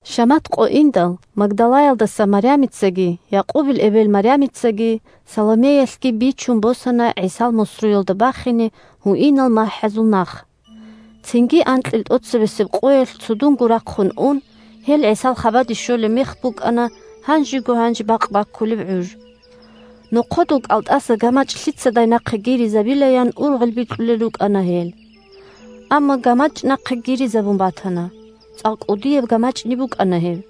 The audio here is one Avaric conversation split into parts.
Шамат къо индал, Магдалаялдаса Марямицаги, Якъубил эбел Марямицаги, Саломеялъги бичун босана ГӀисал мусруялда бахине гьуинал махӀазул нах. Цинги анкьил тӀоцебесеб къоялъ ГьатӀан къоялъ. цудунго рахъун ун, гьел ГӀисал хабаде щолеб мех букӀана гьанжего-гьанже бакъ баккулеб гӀуж. Нохъодул кӀалтӀаса гамачӀ лъицадай нахъе гиризабилаян ургъел бикьулел рукӀана гьел. Амма гамачӀ нахъе гиризабун батана. (ЦӀакъ кӀудияб гамачӀни букӀана гьеб.)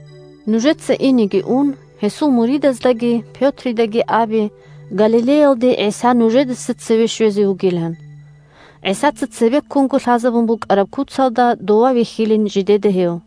Нужеца, инеги ун, гьесул муридаздаги Пётридаги абе Галилеялде ГӀиса нужедаса цеве щвезе вугилан. ГӀисаца цебеккунго лъазабун букӀараб куцалда, дова вихьилин жидеда гьев.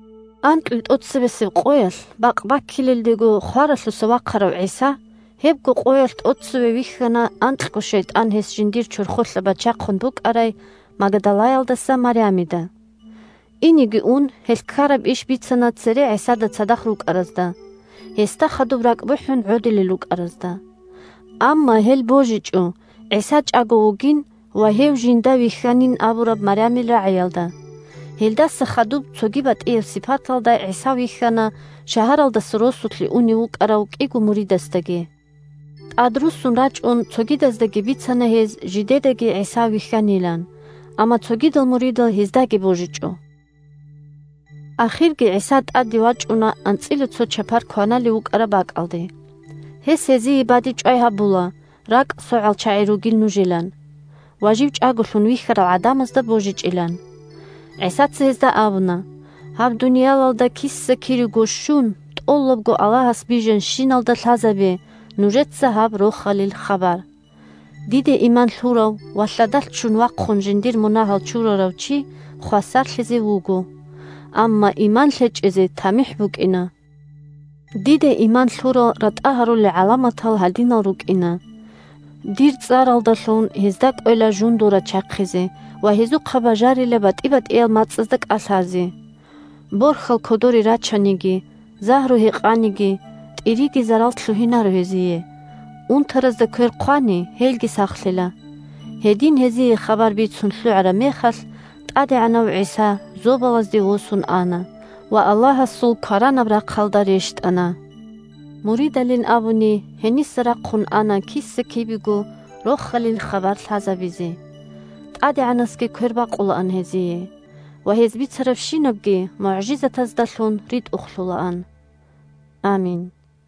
Анкьил тӀоцебесеб къоялъ бакъ баккилелдего хваралъуса вахъарав ГӀиса гьебго къоялъ тӀоцеве вихьана анкьго шайтӀан гьес жиндир чорхолъа бачахъун букӀарай Магдалаялдаса Марямида. Инеги ун, гьелъ ккараб иш бицана цере ГӀисада цадахъ рукӀаразда – гьесда хадуб ракӀ бухӀун гӀодилел рукӀаразда. Амма гьел божичӀо ГӀиса чӀаго вугин ва гьев жинда вихьанин абураб Марямил рагӀиялда. Гьелдаса хадуб цоги батӀияб сипаталда ГӀиса вихьана шагьаралдаса росулъе унев вукӀарав кӀиго муридасдаги. ТӀад руссун рачӀун цогидаздаги бицана гьез жидедаги ГӀиса вихьанилан, амма цогидал муридал гьездаги божичӀо. Ахирги ГӀиса тӀаде вачӀуна анцӀила цо чапар кваналев вукӀараб бакӀалде. Гьес гьезие бадибчӀвай гьабула ракӀ согӀал чагӀи ругин нужилан ва жив чӀаголъун вихьарал гӀадамазда божичӀилан. ГӀисаца гьезда абуна: – Гьаб дуниялалда киса-кирего щун, тӀолабго Аллагьас бижанщиналда лъазабе нужеца гьаб Рохалил хабар. Диде иман лъурав ва лъадалъ ччун вахъун жиндир мунагьал чурарав чи хвасарлъизе вуго. Амма иман лъечӀезе тамихӀ букӀина. Диде иман лъурал ратӀа гьарулел гӀаламатал гьадинал рукӀина: дир цӀаралдалъун гьезда кӀвела жундул рачахъизе ва гьезухъа бажарила батӀи-батӀиял мацӀазда кӀалъазе. Борхьал кодоре рачаниги, загьру гьекъаниги, тӀириги зарал лъугьинаро гьезие; унтаразда квер хъвани, гьелги сахлъила. Гьедин гьезие хабар бицун лъугӀараб мехалъ, ТӀадегӀанав ГӀиса зобалазде восун ана ва Аллагьасул кваранаб рахъалда рещтӀана. Муридалин абуни, гьениса рахъун ана киса-кибего Рохалил хабар лъазабизе. ТӀадегӀанасги квербакъулаан гьезие, ва гьез бицарабщинабги мугӀжизатаздалъун ритӀухълъулаан. Амин!